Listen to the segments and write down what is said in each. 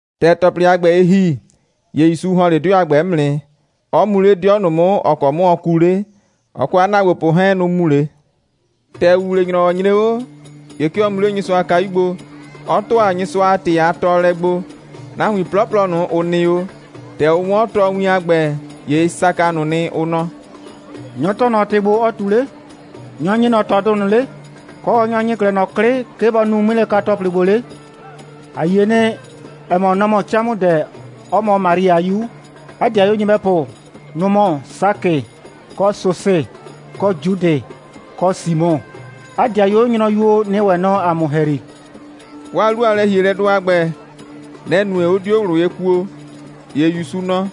‑Tɛ ‑tɔplɩ a ‑gbɛ, ɩ ‑hi, ‑ye ‑Yusu ‑hɔn 'le 'dɩɔ a ‑gbɛ 'mʋ nɩ, 'ɔ mu 'le 'dɩɔ ꞊nʋ 'mʋ, ‑ɔ kɔ 'mʋ ɔ kuu 'le. Ɔ kɔ 'a ‑naagbopʋ 'hɛɛn, nʋ‑ mu 'le. ‑Tɛ ‑wuwle‑nyrɔwɔ nyre 'o, ‑ye 'ke ɔ mu 'le Nyɩsʋa a kayu gbo, 'ɔ ‑tʋa Nyɩsʋa a ‑tɩ a tɔɔlɛ gbo. Nahuin 'plɔplɔ ꞊nʋ, ‑ʋ nɩ 'o, ‑tɛ ʋ 'wɔn 'a tɔɔwin a ‑gbɛ, ‑ye ɩ saka ꞊nʋ nɩ, ʋ nɔ: «Nyɔ‑ tɔɔ ꞊nɔ ‑tɩ ‑gbo, ɔɔ ꞊tu 'le? Nyɔ‑ ‑nyi ꞊nɔ ꞊tɔdʋ ꞊nʋ 'le? Kɔ, nyɔ‑ ‑nyi 'klɛɛ ꞊nɔ 'klɩ, 'ke bɔ nu 'ŋmilɛka‑tɔplɩ ‑gbo 'le? ‑A yie nɩ, ‑ɛ mɔ, nɔ‑ mɔ 'camʋdɛ, 'ɔ mɔ Mari a 'yu. 'A ‑dɩayuo nyɩbɛpʋ, nʋ‑ mɔ Sakɩ, kɔ Sosɩ, kɔ Judɩ, kɔ Simɔ. 'A ‑dɩayuo nyrʋyuo nɩ ‑wɛ nɔ ‑a mʋ ‑hɛyri.» 'Waa 'lu a lɛ‑hielɛdʋ a ‑gbɛ, nɛ‑ nue, 'ʋ 'dio ꞊wlʋ ye kuo. ‑Ye ‑Yusu nɔ: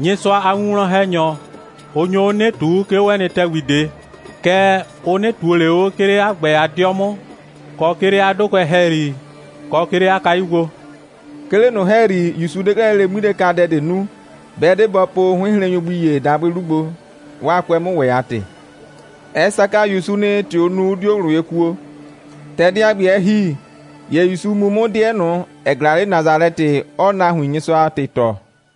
«Nyɩsʋa a winwlɔn‑hɛnyɔ, ʋ nyo 'o 'nɩ ꞊tuu, 'ke 'o 'ɛ nɩ ‑tɛgbi ꞊de. Kɛɛ, ʋ 'nɩ ꞊tuo ꞊le 'o, 'ke 'le 'a ‑gbɛ a 'dɩɔ 'mʋ, kɔ, 'ke 'le 'a 'dʋkʋɛ ‑hɛyri, kɔ, 'ke 'le 'a kayu gbo.» 'Ke 'le ꞊nʋ ‑hɛyri, ‑Yusu 'de 'klɛɛ lele 'ŋmilɛkadɛ ꞊de nu, 'bɛ 'de bɔ po 'hʋɩnhrennyʋ gbi ‑ye dabʋɩ 'lu gbo, 'waa 'kʋɛ 'mʋ ‑wɛ a ‑tɩ. Ɛ saka ‑Yusu nɩ, ‑tɛ ʋ nu, 'ʋ 'dio ꞊wlʋ ye kuo. ‑Tɛ dɛ a ‑gbɛ, ɛ ‑hi, ‑ye ‑Yusuu 'mʋ mu 'dɩɛ ꞊nʋ, ‑ɛ ꞊glaa 'le Nasalɛtɩ, 'ɔɔ nahuin Nyɩsʋa a ‑tɩ tɔɔ.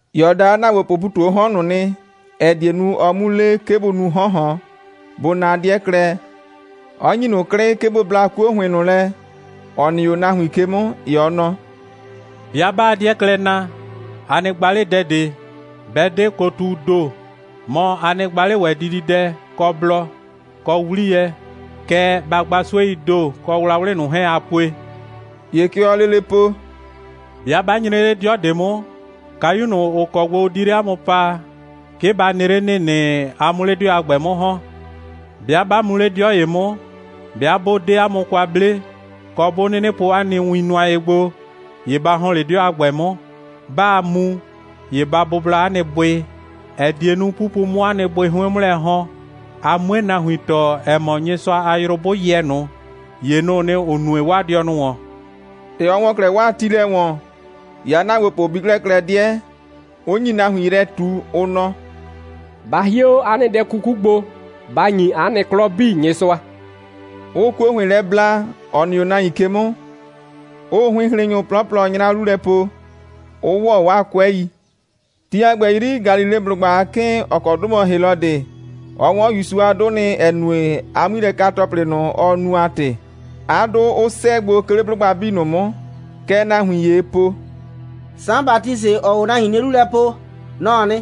‑Ye ɔ da 'a ‑naagbopʋʋ ‑pu ꞊tu 'o 'hɔn ꞊nʋ nɩ, ‑ɛ die nu, ɔ 'mu le, 'ke bʋ nu 'hɔn ‑hɔn, bʋ na 'dɩɛ klɛ, 'ɔ ‑nyi ꞊nʋ 'klɩ, 'ke bʋ bla 'kuo ‑hʋɩn lɛ, ‑ɔ nɩ 'o nahuin ke 'mʋ, ‑ye ɔ nɔ: «'Bɩa 'baa 'dɩɛ klɛ na, a nɩ gba 'le dɛ ꞊de, 'bɛ 'de kotuu ‑do, mɔ, a nɩ gba 'le ‑wɛ dididɛ, kɔ blɔ, kɔ 'wliyɛ, kɛɛ, ba gba 'sueii ‑do, kɔ wlawlɩ ꞊nʋ 'hɛɛn, aa pue.» ‑Ye kɛ ɔɔ lele po: «'Bɩa 'ba nyre 'le 'dɩɔ ꞊de 'mʋ, kayu ꞊nʋ, ‑ʋ kɔ gbo ʋ di 'le 'a mʋ paa, 'ke ba nɩ 'le ‑nɩnɩ, a 'mʋ 'le 'dɩɔ a ‑gbɛ 'mʋ ‑hɔn. 'Bɩa 'ba mu 'le 'dɩɔ ‑ye 'mʋ, 'bɩa 'bʋ 'de 'a mʋ kwa 'ble, kɔ, 'bʋ 'nɩnɩ po 'a nɩ win nʋa ye gbo, ‑ye ba ‑hɔn 'le 'dɩɔ a ‑gbɛ 'mʋ. 'Baa mu, ‑ye ba bʋbla 'a nɩ bʋɩ, ‑ɛ die nu, 'pupu 'mʋ 'o 'a nɩ bʋɩ 'hʋɩn 'mʋ lɛ ‑hɔn, a 'mue nahuin tɔɔ, ‑ɛ mɔ, Nyɩsʋa a yrʋ 'bʋ yɛ ꞊nʋ, ‑ye nʋ‑ʋ nɩ, ‑ʋ nue 'waa dɩɔnʋ ‑wɔn.» ‑Tɛ ɔ ‑wɔ 'klɛɛ 'waa tiilɛ ‑wɔn, ‑ye 'a ‑naagbopʋ bi 'klɛɛ klɛ 'dɩɛ, 'ʋ nyi nahuin yrɛ ꞊tu, ʋ nɔ: «Ba hie 'o 'a nɩ dɛ 'kuku gbo, ba ‑nyi 'a nɩ 'klɔ 'bii Nyɩsʋa!» 'ʋʋ 'kuo ‑hʋɩn lɛ bla, ‑ɔ nɩ 'o nahuin ke 'mʋ, kɔ, 'ʋʋ 'hʋɩnhrennyʋ 'plɔplɔ 'nyra 'lu lɛ po, 'ʋ ‑wɔ 'waa 'kʋɛi. Ti a ‑gbɛ 'yri, Galileblʋgba a 'kɩɩn, ‑ɔ kɔ 'dʋ mɔ Helɔdɩ, ɔ 'wɔn ‑Yusu a 'dʋ nɩ, ‑ɛ nue, 'a 'ŋmilɛka‑tɔplɩ ꞊nʋ, ɔ nu a ‑tɩ, 'a 'dʋ 'ʋ 'sɛɛ gbo, 'ke 'le 'blʋgba 'bii ꞊nʋ 'mʋ. Kɛ nahuin ‑yee po: «Saan Batisɩ, ‑ɔɔ o nahuin 'nie 'lu lɛ po, nɔ‑ɔ nɩ.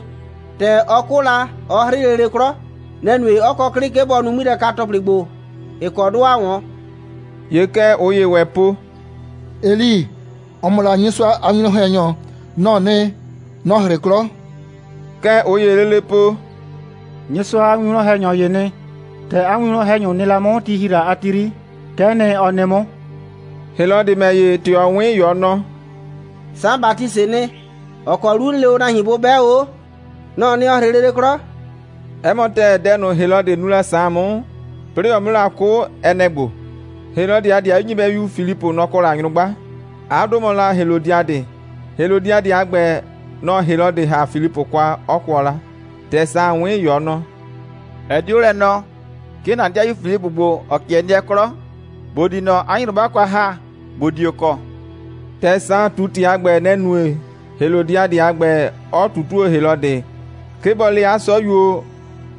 ‑Tɛ ɔ 'kʋ la, ɔ 'hrɩ lele 'klɔ. Nɛ‑ nue, 'ɔ kɔ 'klɩ, 'ke bɔ nu 'ŋmilɛka‑tɔplɩ ‑gbo, ‑ɩ kɔ 'dʋ ‑aa 'wɔn.» ‑Ye kɛ ꞊ʋ ‑yee ‑wɛ po: «Eli, ‑ɔ mɔ la Nyɩsʋa a winwlɔn‑hɛnyɔ, nɔ‑ɔ nɩ, nɔ‑ 'hrɩ 'klɔ.» Kɛ ꞊ʋ ‑yee lele po: «Nyɩsʋa a winwlɔn‑hɛnyɔ ‑yee nɩ. ‑Tɛ 'a winwlɔn‑hɛnyʋ nɩ la 'mʋ, ti ‑hi la a ti 'yri, kɛ'ɛ nɩ, ɔ nɩ 'mʋ.» Helɔdɩ ‑mɛ ‑ye, ‑tɛ ɔ 'wɩn, ‑ye ɔ nɔ: «Saan Batisɩɩ nɩ, ‑ɔ kɔ 'lu 'n le o nahuin bʋ 'bɛ o 'o, nɔ‑ɔ nɩ, ‑ɔ 'hrɩ lele 'klɔ.» 'Ɛ mɔ ‑tɛɛ, dɛ ꞊nʋ, Helɔdɩ nu la Saan 'mʋ, 'plɩɩ ɔ 'mʋ la 'kʋ, ɛ nɛ‑ ‑gbo: Helɔdɩ, 'a ‑dɩayu nyɩbɛyu Filipʋ, nɔ‑ kɔ la nyrʋgba. 'A 'dʋ mɔ la Helɔdiadɩ. Helɔdiadɩ a ‑gbɛ, nɔ‑ Helɔdɩ ‑ha la Filipʋ kwa, 'ɔ kʋɔ la. ‑Tɛ Saan 'wɩn la, ‑ye ɔ nɔ: «Ɛ 'de 'o lɛ nɔɔ, 'ke ‑na ‑dɩayu Filipʋ ‑gbo, ‑ɔ 'kɩɛ nɩɛ 'klɔ, ‑bo di ꞊nɔ 'a nyrʋgba kwa ‑ha, ‑bo dio kɔ.» ‑Tɛ Saan ꞊tu ‑tɩ a ‑gbɛ, nɛ‑ nue, Helɔdiadɩ a ‑gbɛ 'ɔ ꞊tutuo Helɔdɩ, 'ke bɔ le 'a 'sɔyuo,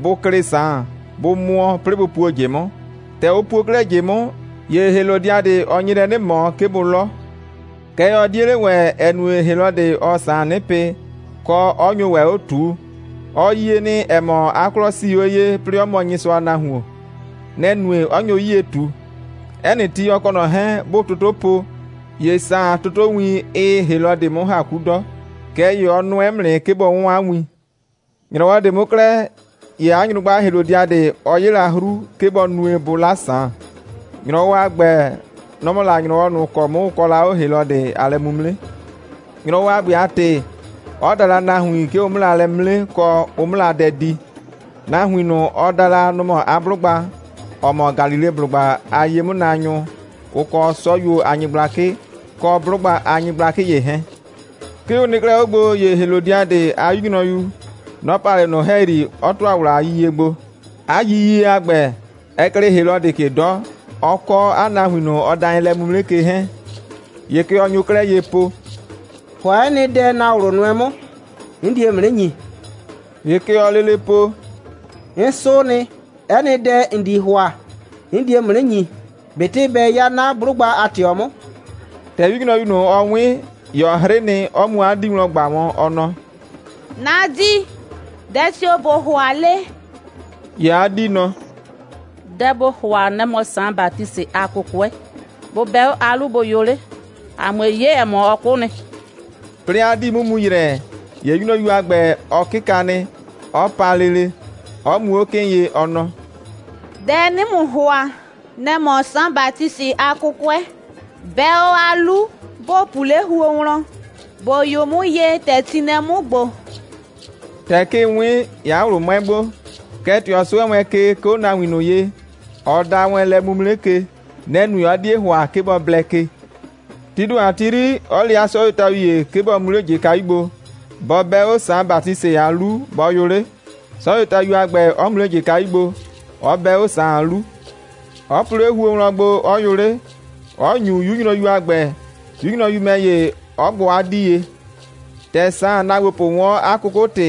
bʋ klɩ Saan, bʋ mʋɔ, 'plɩɩ bʋ puo ꞊jɩ 'mʋ. ‑Tɛ ʋ puo 'klɛɛ ꞊jɩ 'mʋ, ‑ye Helɔdiadɩ, ɔ nye lɛ 'nɩ ꞊mɔ, 'ke bʋ 'lɔ. Kɛɛ, ɔ 'die 'le ‑wɛ, ‑ɛ nue, Helɔdɩ, ɔɔ Saan 'nɩ pɩ, kɔ, 'ɔ nyo ‑wɛ 'o ꞊tuu. Ɔ yie nɩ, ‑ɛ mɔ, 'a 'klɔ 'sii 'o ye, 'plɩɩ 'ɔ mɔ Nyɩsʋa a nahuon. Nɛ‑ nue, 'ɔ nyo 'yie ꞊tu. 'Ɛ nɩ ti, ɔ kɔ ꞊nɔ 'hɛɛn, 'bʋʋ toto po, ‑ye Saan a totowin, ɩɩ Helɔdɩ 'mʋ ‑ha 'ku 'dɔ, kɛɛ ‑ye ɔ nʋɛ 'mʋ nɩ, 'ke bɔ 'wɔn 'a win. ‑Nyrɔwɔ ꞊de 'mʋ 'klɛɛ, ‑ye 'a nyrʋgba Helɔdiadɩ, ɔ 'ye la 'hru, 'ke bɔ nue, bʋ 'la Saan. ‑Nyrɔwɔ a ‑gbɛ, nɔ‑ mɔ la ‑nyrɔwɔ ꞊nʋ ‑kɔ 'mʋ, ʋ kɔ la 'o Helɔdɩ a lɛ'mimre. ‑Nyrɔwɔ a ‑gbɛ a ‑tɩ, 'ɔ da la nahuin, 'ke ʋ 'mʋ la lɛ 'mre, kɔ, ʋ 'mʋ la dɛ di. Nahuin ꞊nʋ, ɔ da la, nʋ‑ mɔ la 'a 'blʋgba, ‑ɔ mɔ Galileblʋgba a ye'mʋnaanyʋ, ʋ kɔ 'sɔyuo a nyɩgblakɩ, kɔ 'blʋgba a nyɩgblakɩ ‑ye 'hɛɛn. 'Ke ʋ nɩ 'klɛɛ 'o gbo, ‑ye Helɔdiadɩ a 'yu nyrɔyu, nɔ‑ pa 'le ꞊nʋ ‑hɛyri, 'ɔ ‑tʋa ‑wla a yiyie gbo. 'A yiyie a ‑gbɛ, ɛ klɩɩ Helɔdɩ ke 'dɔ, ɔ kɔ nahuin ꞊nʋ, ɔ da wɛn lɛ'mimre ke 'hɛɛn. ‑Ye kɛ ɔ nyo 'klɛɛ ye po: «‑Hʋa 'ɛ nɩ dɛ, ‑na ꞊wlʋ nʋɛ 'mʋ. 'N die ‑mʋ 'nɩ ‑nyi.» ‑Ye kɛ ɔɔ lele po: «'N 'sʋʋ nɩ, 'ɛ nɩ dɛ, ‑n di ‑hʋa, 'n die ‑mʋ 'nɩ ‑nyi, ꞊betɩ bɛ 'ya 'na 'blʋgba a ꞊tɩɔ 'mʋ.» ‑Tɛ 'yunyrɔyu ꞊nʋ, ɔ 'wɩn, ‑ye ɔ 'hrɩ nɩ, 'ɔ mu 'a 'dii wlɔn ꞊gba wɔn, ɔ nɔ: «'Na 'dii, dɛ tio‑ ꞊bo ‑hʋa 'le?» ‑Ye 'a 'dii nɔ: «Dɛ ‑bo ‑hʋa, nɛ‑ mɔ Saan Batisɩ a 'kʋkʋɛ. Bʋ 'bɛ 'o 'a 'lu, bʋ yʋ 'le, ‑a 'mue 'ye, ‑ɛ mɔ, ɔ 'kʋ nɩ.» 'Plɩɩ 'a 'dii 'mʋ mu ‑yrɛ, ‑ye 'yunyrɔyu a ‑gbɛ, ɔ 'kɩka nɩ, 'ɔ pa lele, 'ɔ mu 'o 'kɩɩn ye, ɔ nɔ: «Dɛ 'nɩɩ ‑mʋ ‑hʋa, nɛ‑ mɔ Saan Batisɩ a 'kʋkʋɛ. 'Bɛ 'o 'a 'lu, ‑bo pu 'le huo wlɔn, ‑bo yʋ 'mʋ ye, ‑tɛ ti nɩ lɛ 'mʋ ‑gbo.» ‑Tɛ 'kɩɩn 'wɩn, ‑ye 'a ꞊wlʋ 'mʋɛ gbo. Kɛɛ, ‑tɛ ɔ 'sʋɛ wɛn ke, 'ke 'o nahuin ꞊nʋ ye, ɔ da wɛn lɛ'mimre ke, nɛ‑ nue, 'ɔ 'die ‑hʋa, 'ke bɔ blɛ ke. Tii ‑do a ti 'yri, 'ɔ le 'a 'sɔyuotayu ‑ye, 'ke bɔ mu 'le ꞊jɩkayu gbo, bɔ 'bɛ 'o Saan Batisɩ a 'lu, bɔ yʋ 'le, 'sɔyuotayu a ‑gbɛ 'ɔ mu 'le ꞊jɩkayu gbo, 'ɔ 'bɛ 'o Saan a 'lu, 'ɔ pu 'le huo wlɔn gbo, 'ɔ yʋ 'le, 'ɔ ‑nyu 'yu nyrɔyu a ‑gbɛ, 'yu nyrɔyu ‑mɛ ‑ye 'ɔ gbʋ 'a 'dii ye. ‑Tɛ Saan a ‑naagbopʋ 'wɔn 'a 'kʋkʋ‑tɩ,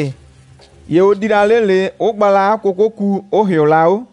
‑ye ʋ di la 'le ꞊le, 'ʋ gba la 'a 'kʋkʋku, 'ʋ ‑hɩɔ la 'o.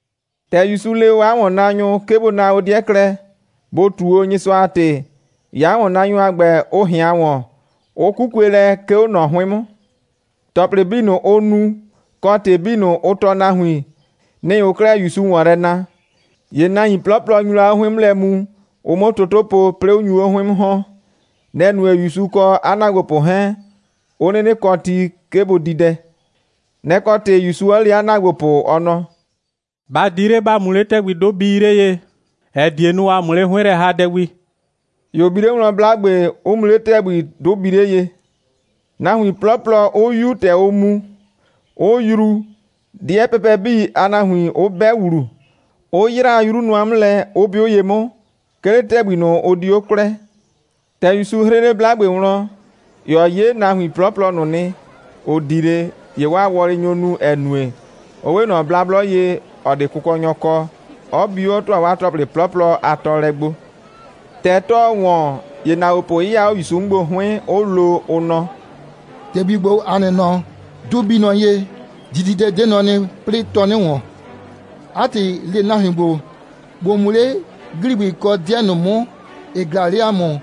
‑Tɛ ‑Yusu le o 'a ‑wɔnnaanyʋ, 'ke bʋ na o 'dɩɛ klɛ, bʋ ꞊tu o Nyɩsʋa a ‑tɩ, ‑ye 'a ‑wɔnnaanyʋ a ‑gbɛ, ʋ ꞊hɩan ‑wɔn, 'ʋ 'kukue lɛ, 'ke 'o ꞊nɔ 'hʋɩn 'mʋ. ‑Tɔplɩ 'bii ꞊nʋ, ʋ nu, kɔ, ‑tɩ 'bii ꞊nʋ, ʋ tɔɔ nahuin, nɩ‑ ʋʋ 'klɛɛ ‑Yusu ‑wɔn yrɛ na. ‑Ye nahuin 'plɔplɔ nyu la 'o 'hʋɩn 'mʋ lɛ mu, ʋ 'mʋ toto po, 'plɩɩ 'ʋ nyu 'o 'hʋɩn 'mʋ ‑hɔn. Nɛ‑ nue, ‑Yusu kɔ 'a ‑naagbopʋ 'hɛɛn 'ʋ 'nɩnɩ kɔ ti, 'ke bʋ di dɛ. Nɛ‑ kɔ ‑tɩ, ‑Yusu 'ɔ le 'a ‑naagbopʋ, ɔ nɔ: «Ba di 'le, ‑ba mu 'le ‑tɛgbi, 'dʋ bii 'le ye, ‑ɛ die nu, a 'mʋ 'le 'hʋɩn lɛ ‑ha dɛ gbi!» ‑Ye ʋ bi 'le wlɔn 'blagbe, 'ʋ mu 'le ‑tɛgbi, 'dʋ bii 'le ye, nahuin 'plɔplɔ 'ʋ 'yu, ‑tɛ ʋʋ mu, 'ʋ yruu, 'dɩɛ pɛpɛ 'bii a nahuin 'ʋ 'bɛ ‑wlu, 'ʋ 'yraa 'yru nʋa 'mʋ lɛ, 'ʋ 'bɩʋ ye 'mʋ, 'ke 'le ‑tɛgbi ꞊nʋ, ʋ di 'o kwlɛɛ. ‑Tɛ ‑Yusu 'hrɩ 'le 'blagbe wlɔn, ‑ye ɔ 'ye nahuin 'plɔplɔ ꞊nʋ nɩ, ‑ʋ di 'le, ‑ye 'waa wɔlɩ nyo nu, ‑ɛ nue, ʋ 'we ꞊nɔ blablɔ ye, ‑ɔ 'de kʋkɔnyɔ kɔ, 'ɔ bi 'o, 'ɔ ‑tʋa 'waa ‑tɔplɩ 'plɔplɔ a tɔɔlɛ gbo. ‑Tɛ 'tɔɔ ‑wɔn, ‑ye ‑naagbopʋ 'yɩya 'o ‑Yusu 'mʋ gbo 'hʋɩn, 'ʋ lo, ʋ nɔ: «‑Tɛgbi ‑gbo, ‑a nɩ nɔ, 'dʋ bii nɔ ye, dididɛ 'de nɔ nɩ, 'plɩɩ, 'tɔɔ 'nɩ ‑wɔn. 'A ‑tɩ, le nahuin ‑gbo, bʋ mu 'le ‑gligbɩ kɔ 'dɩɛ ꞊nʋ 'mʋ, ‑ɩ ꞊glaa 'le ‑a mʋ,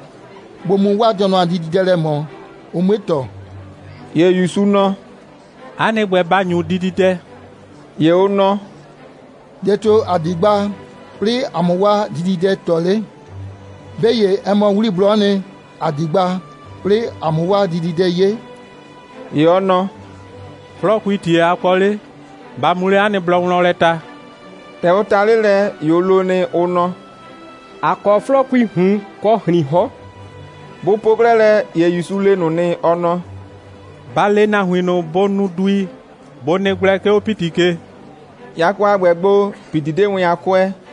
bʋ mu 'waa dɩɔnʋ a dididɛ lɛ ꞊mɔ, ʋ 'mue ‑tɔ!» ‑Ye ‑Yusu nɔ: «'A nɩ ‑gbɛ, ba ‑nyu dididɛ!» ‑Ye ʋ nɔ: «Dɛ tio‑ ‑a di gba, 'plɩɩ ‑a 'mʋ 'waa dididɛ ‑tɔ 'le? 'Be ‑ye, ɛ mɔ 'wliblɔ'ɔ nɩ, ‑a di gba, 'plɩɩ ‑a 'mʋ 'waa dididɛ 'ye.» ‑Ye ɔ nɔ: «'Flɔɔkuii ‑tie a kɔ 'le? Ba mu 'le 'a nɩ blɔ wlɔn lɛ ta!» ‑Tɛ ʋ ta 'le lɛ, ‑ye ʋ lo nɩ, ʋ nɔ: «‑A kɔ 'flɔɔkuii ꞊hun kɔ ‑hriin 'hɔn.» Bʋ po 'klɛɛ lɛ, ‑ye ‑Yusu le ꞊nʋ nɩ, ɔ nɔ: «Ba le nahuin ꞊nʋ, bʋ nu dui, bʋ nɩ gblɛ, 'ke 'o ‑piti ke!» Yakɔ a ‑gbɛ gbo, ‑piti 'de wɛn a 'kʋɛɛ,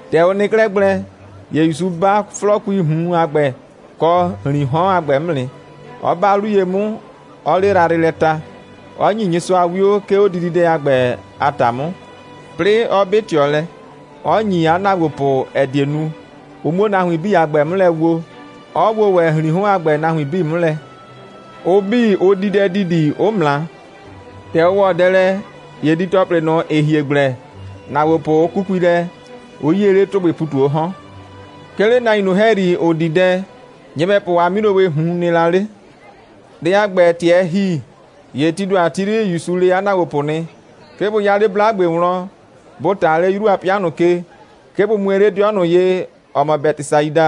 ‑Tɛ ʋ nɩ 'klɛɛ gblɛ, ‑ye ‑Yusu 'ba 'flɔɔkuii ꞊hun a ‑gbɛ kɔ ‑hriin 'hɔn a ‑gbɛ 'mʋ nɩ, 'ɔ 'ba 'lu ye 'mʋ, 'ɔɔ 'le yrayrɩ lɛ ta, 'ɔ ‑nye Nyɩsʋa 'wio, 'ke 'o dididɛ a ‑gbɛ a ‑ta 'mʋ, 'plɩɩ 'ɔ 'bɩ ꞊tɩɔ lɛ, 'ɔ ‑nyi 'a ‑naagbopʋ, ‑ɛ die nu, ʋ 'muo nahuin 'bii a ‑gbɛ 'mʋ lɛ woo, 'ɔ woo ‑wɛ ‑hriin 'hɔn a ‑gbɛ nahuin 'bii 'mʋ lɛ. Ʋ 'bii, ʋ di dɛ ‑didi, 'ʋ ꞊mra. ‑Tɛ ʋ ‑wɔ dɛ lɛ, ‑ye didi‑tɔplɩ ꞊nʋ, ‑ɩ hie gblɛ, ‑naagbopʋ 'ʋ 'kukui lɛ, 'ʋ 'yie 'le ‑tʋgbɩwɩɩ ‑pu ꞊tu 'o 'hɔn. 'Ke 'le nahuin ꞊nʋ ‑hɛyri, ‑ʋ di dɛ, nyɩbɛpʋ a 'milowɩɩ ꞊hun nɩ la 'le. Dɛ a ‑gbɛ, ‑tɛ ɛ ‑hi, ‑ye tii ‑do a ti 'yri, ‑Yusu le 'a ‑naagbopʋ nɩ, 'ke bʋ 'ya 'le 'blagbe wlɔn, bʋ ꞊ta 'le 'yru a 'pɩa ꞊nʋ ke, 'ke bʋ mue 'le 'dɩɔ ꞊nʋ ye, ‑ɔ mɔ Bɛtɩsaida,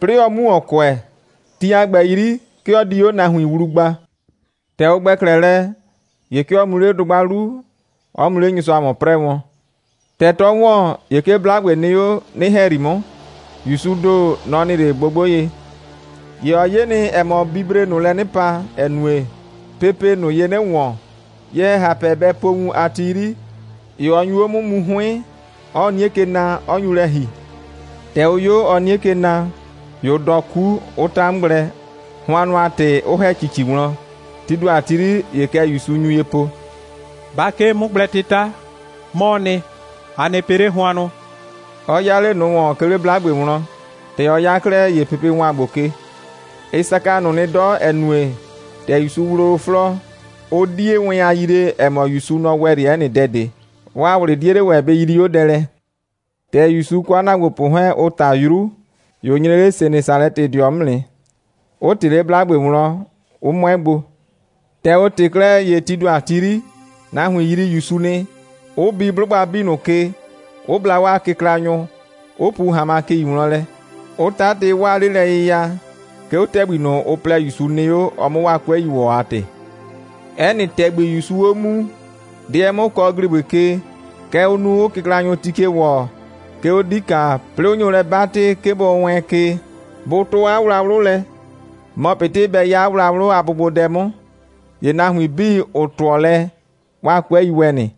'plɩɩ ɔ 'mu ‑wɔn kʋɛ. Ti a ‑gbɛ 'yri, 'ke ɔ di 'o nahuin wlu gba. ‑Tɛ ʋ ‑gbɛ 'klɛɛ lɛ, ‑ye 'ke ɔ mu 'le dʋgba 'lu, 'ɔ mu 'le Nyɩsʋa ‑wɔn 'prɛɛ wɔn. ‑Tɛ 'tɔ ‑wɔn, ‑ye 'ke 'blagbe nɩ 'o 'nɩ‑hɛyri 'mʋ, ‑Yusuu ‑do, nɔ‑ nɩ 'le gbogbo ye. ‑Ye ɔ 'ye nɩ, ‑ɛ mɔ, bibree ꞊nʋ lɛ 'nɩ pa, ‑ɛ nue, pepee ꞊nʋ ye 'nɩ ‑wɔn. Ye‑hɛhapɛ bɛ po wun a ti 'yri, ‑ye ɔ nyu 'o 'mʋ mu 'hʋɩn, 'ɔɔ 'nie ke na, 'ɔ nyu lɛ ‑hi. ‑Tɛ ʋ 'yo, ɔɔ 'nie ke na, ‑ye ʋ dɔɔ 'ku, 'ʋ 'ta 'mʋ gblɛ, hʋannʋ a ‑tɩ, 'ʋ ‑hɛ ‑cici wlɔn. Tii ‑do a ti 'yri, ‑ye kɛ ‑Yusu nyu ye po: «Ba 'kee 'mʋgblɛ'tɩta. 'Mɔɔ nɩ. A nɩ pɩ 'le hʋannʋ!» 'ɔ 'ya 'le ꞊nʋ ‑wɔn, 'ke 'le 'blagbe wlɔn. ‑Tɛ ɔ 'ya 'klɛɛ, ‑ye pepe ‑wan gbo ke. Ɩ saka ꞊nʋ nɩ 'dɔ, ‑ɛ nue, ‑tɛ ‑Yusu wloo 'flɔɔ, ʋ 'die wɛn a yree, ‑ɛ mɔ, ‑Yusu, nɔ‑ ‑wɛ 'le 'ɛ nɩ dɛ ꞊de. 'Waa ꞊wlɩ 'die 'le ‑wɛ bɩ yrii 'o dɛ lɛ. ‑Tɛ ‑Yusu, ɔ kɔ 'a ‑naagbopʋ 'hɛɛn, ʋ ꞊ta 'yru, ‑ye ʋ nyre 'le Senesalɛtɩdɩɔ 'mʋ nɩ, 'ʋ ꞊tɩ 'le 'blagbe wlɔn, 'ʋ mʋɛ gbo. ‑Tɛ ʋ ꞊tɩ 'klɛɛ, ‑ye tii ‑do a ti 'yri, nahuin yrii ‑Yusu nɩ, 'ʋ bi 'blʋgba 'bii ꞊nʋ ke, 'ʋ bla 'waa kɩklanyʋ, 'ʋ pu ‑hanmakɩi wlɔn lɛ, 'ʋ 'tatɩ 'waa 'lelɛyɩya, 'ke 'o ‑tɛgbi ꞊nʋ, ʋ plɛ, ‑Yusu nɩ 'o, ɔ 'mʋ 'waa 'kʋɛi ‑wɔ a ‑tɩ. 'Ɛ nɩ ‑tɛgbi, ‑Yusuu 'o muu, 'dɩɛ 'mʋ kɔ ‑gligbɩ ke, kɛ ʋʋ nu, 'ʋʋ kɩklanyʋ ti ke ‑wɔ, 'ke 'o 'dika, 'plɩɩ 'ʋ nyo lɛ 'batɩ, 'ke bɔ wɛɛn ke, bʋ 'tʋ 'a wlawlʋ lɛ, mɔ ꞊betɩ bɛ 'ya 'a wlawlʋ a bʋgbodɛ 'mʋ. ‑Ye nahuin 'bii, ‑ʋ 'tʋɔ lɛ, 'waa 'kʋɛi ‑wɛ nɩ.